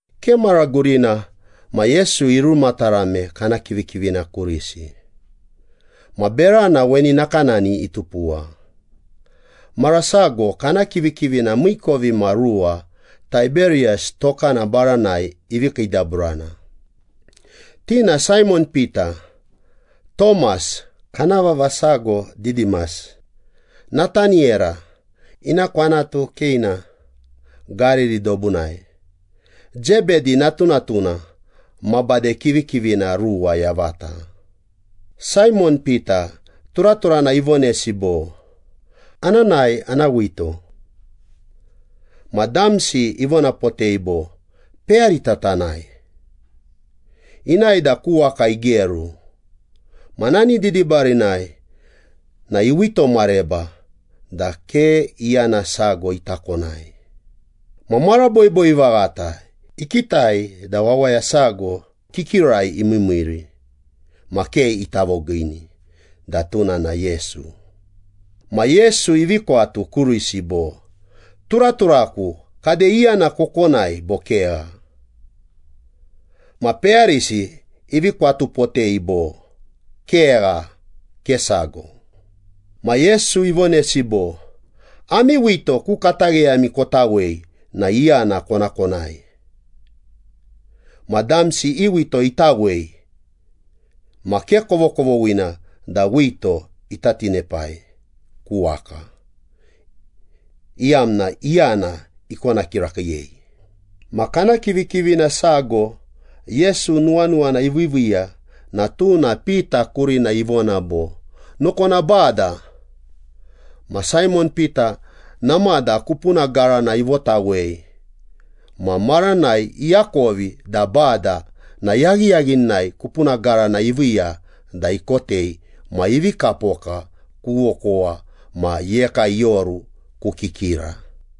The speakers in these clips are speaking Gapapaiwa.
Ke mara gurina ma Yesu irumatarame kana kivikivina kurisi, ma berana weni nakanani itupuwa. Mara sago kana kivikivina miikovimaruwa Taiberiyas tokana baranai ivi kiidaburana. Ti na Saimon Pita, Tomas (kana vava sago Didimas), Nataniyera (ina kwanatu Keina, Gariri dobunai), Zebedi natunatuna ma bade kivikivina ruwa yavata. Saimon Pita turaturana ivonesi bo, “Ana nae ana wito.” Ma damsi ivonapotei bo, “Peyarita tanae.” Inae da ku waka igeru, ma nani didibarinai na iwito mareba da ke iyana sago ita konai. Ma mara boiboi vaghata ikitai da wawaya sago kikirai imiimiiri ma ke ita vogiini da tuna na Yesu. Ma Yesu ivi kwatu kurisi bo, “Turaturaku, kade iyana kokonai, bo kegha?” Ma peyarisi ivi kwatupotei bo, “Kegha. Ke sago.” Ma Yesu ivonesi bo, “Ami wito ku katagheyami kotawei na iyana kona konai.” Ma damsi i wito itawei ma ke kovokovoghina da wito ita tinepai ku waka, iyamna iyana ikona kirakiiyei. Ma kana kivikivina sago Yesu nuwanuwana iviiviiya na tuna Pita kurina ivona bo, “Nokona Bada.” Ma Saimon Pita namada kupuna garana ivotawei ma maranai iakovi da Bada na yaghiyaghinai kupuna garana iviiya da ikotei ma ivi kapoka ku okowa ma iyeka ioru ku kikira.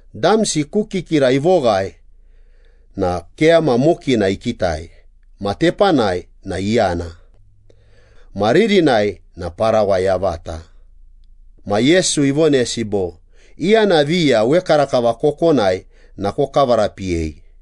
Damsi ku kikira ivoghae na keyama mokina ikitai ma tepanai na iyana. Ma ririnai na parawa yavata. Ma Yesu ivonesi bo, “Iyana viya wekarakava kokonai na kokavarapiyei.”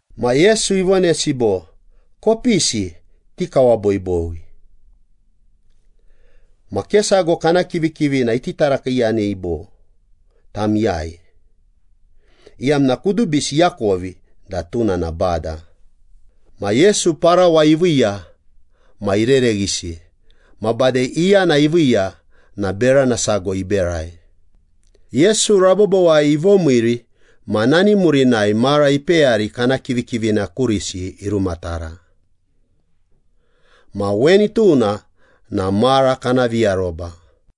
Ma Yesu ivonesi bo, “Kopisi. Tikawaboiboi.” Ma ke sago kana kivikivina iti tarakiiyanei bo, “Tam iyai?” iyamna kudubisi iakovi da tuna na Bada. Ma Yesu parawa iviiya ma irereghisi, ma bade iyana iviiya na berana sago iberai. Yesu rabobowai ivomiiri ma nani murinai mara ipeyari kana kivikivina kurisi irumatara. Ma weni tuna na mara kana viaroba.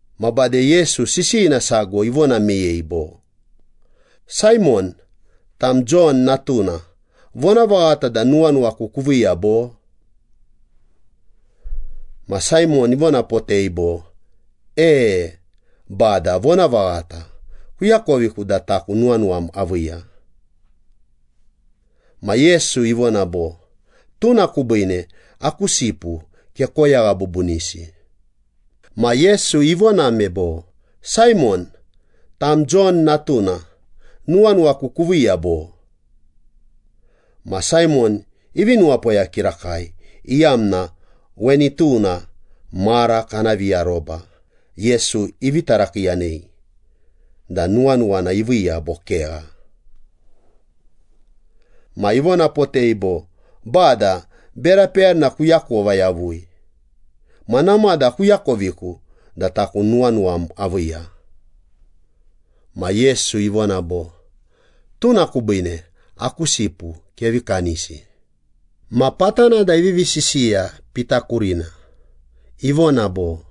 Ma bade Yesu sisiyina sago ivona meyei bo, “Saimon, tam Jon natuna, vonavaghata da nuwanuwaku kuviiya bo?” Ma Saimon ivonapotei bo, “E, Bada, vonavaghata. Kuakoviku da taku nuwanuwam aviiya.” Ma Yesu ivona bo, “Tuna kubiine aku sipu kekoyagha bubunisi.” Ma Yesu ivoname bo, “Saimon, tam Jon natuna, nuwanuwaku kuviiya bo?” Ma Saimon ivi nuwapoya kirakai, iyamna weni tuna mara kana viaroba Yesu ivi tarakiiyanei da nuwanuwana iviiya bo kegha. Ma ivonapotei bo, “Bada, bera peyarina kuakova yavui. Ma namada kuakoviku da taku nuwanuwam aviiya.” Ma Yesu ivona bo, “Tuna kubiine aku sipu kevi kanisi.” Ma patana da ivivi sisiya Pita kurina, ivona bo,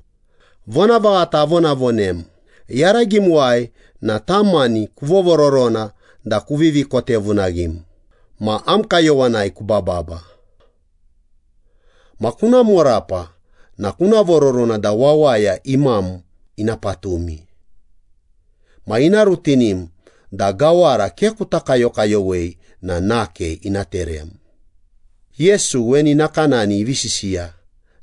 “Vonavaghata avonavonem, yaragimuwai na tam mani kuvovororona da kuvivi kotevunaghim, ma am kayowanai kubababa. Ma kuna morapa na kuna vororona da wawaya imam ina patumi. Ma ina rutinim da gawara ke kuta kayokayowei na nake ina terem.” Yesu weni nakanani ivi sisiya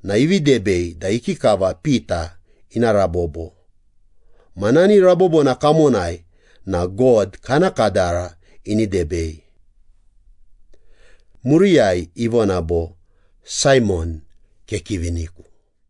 na ivi debei da ikikava Pita ina rabobo, ma nani rabobona kamonai na God kana kadara ini debei. Muriyai ivona bo, “Saimon, kekiviniku.”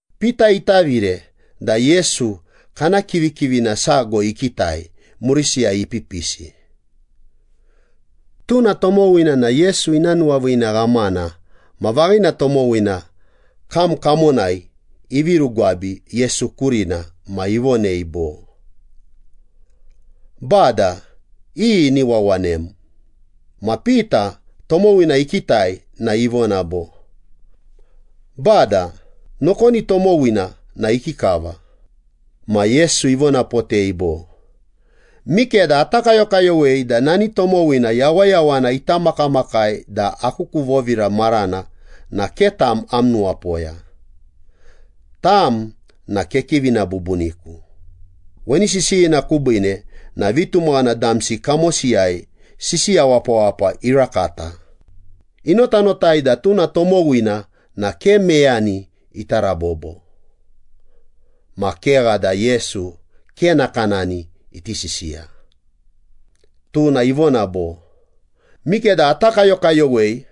Pita itavire na Yesu kana kivikivina sago ikitai, murisiyai ipipisi. Tuna tomowina na Yesu ina nuwaviina ghamana ma vaghina tomowina kam kamonai ivi rugwabi Yesu kurina ma ivonei bo, “Bada, iyi ini wawanem?” Ma Pita tomowina ikitai na ivona bo, “Bada, nokoni tomowina na ikikava?” Ma Yesu ivonapotei bo, “Mikeda ata kayokayowei da nani tomowina yawayawana ita makamakai da aku ku vovira marana na ke tam am nuwapoya. Tam na kekivina bubuniku.” Weni sisiyina kubiine na vitumaghana damsi kamosiyai sisiya wapawapa irakata, inotanotai da tuna tomowina na ke meyani ita rabobo. Ma kegha da Yesu ke nakanani iti sisiya, tuna ivona bo, “Mikeda ata kayokayowei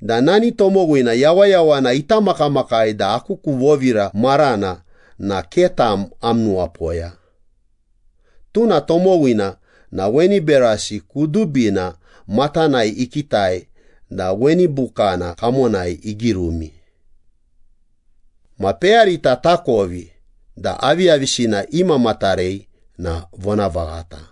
da nani tomowina yawayawana ita makamakai da aku ku vovira marana na ke tam am nuwapoya.” Tuna tomowina na weni berasi kudubina matanai ikitai da weni bukana kamonai igirumi. Ma peyarita takovi da aviyavisina imamatarei na vonavaghata.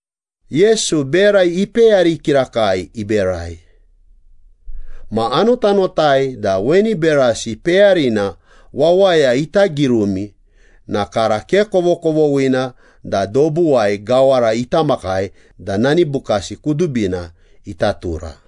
Yesu bera ipeyari kirakai iberai. Ma anotanotai da weni berasi peyarina wawaya ita girumi na kara ke kovokovoghina da dobuwai gawara ita makai da nani bukasi kudubina ita tura.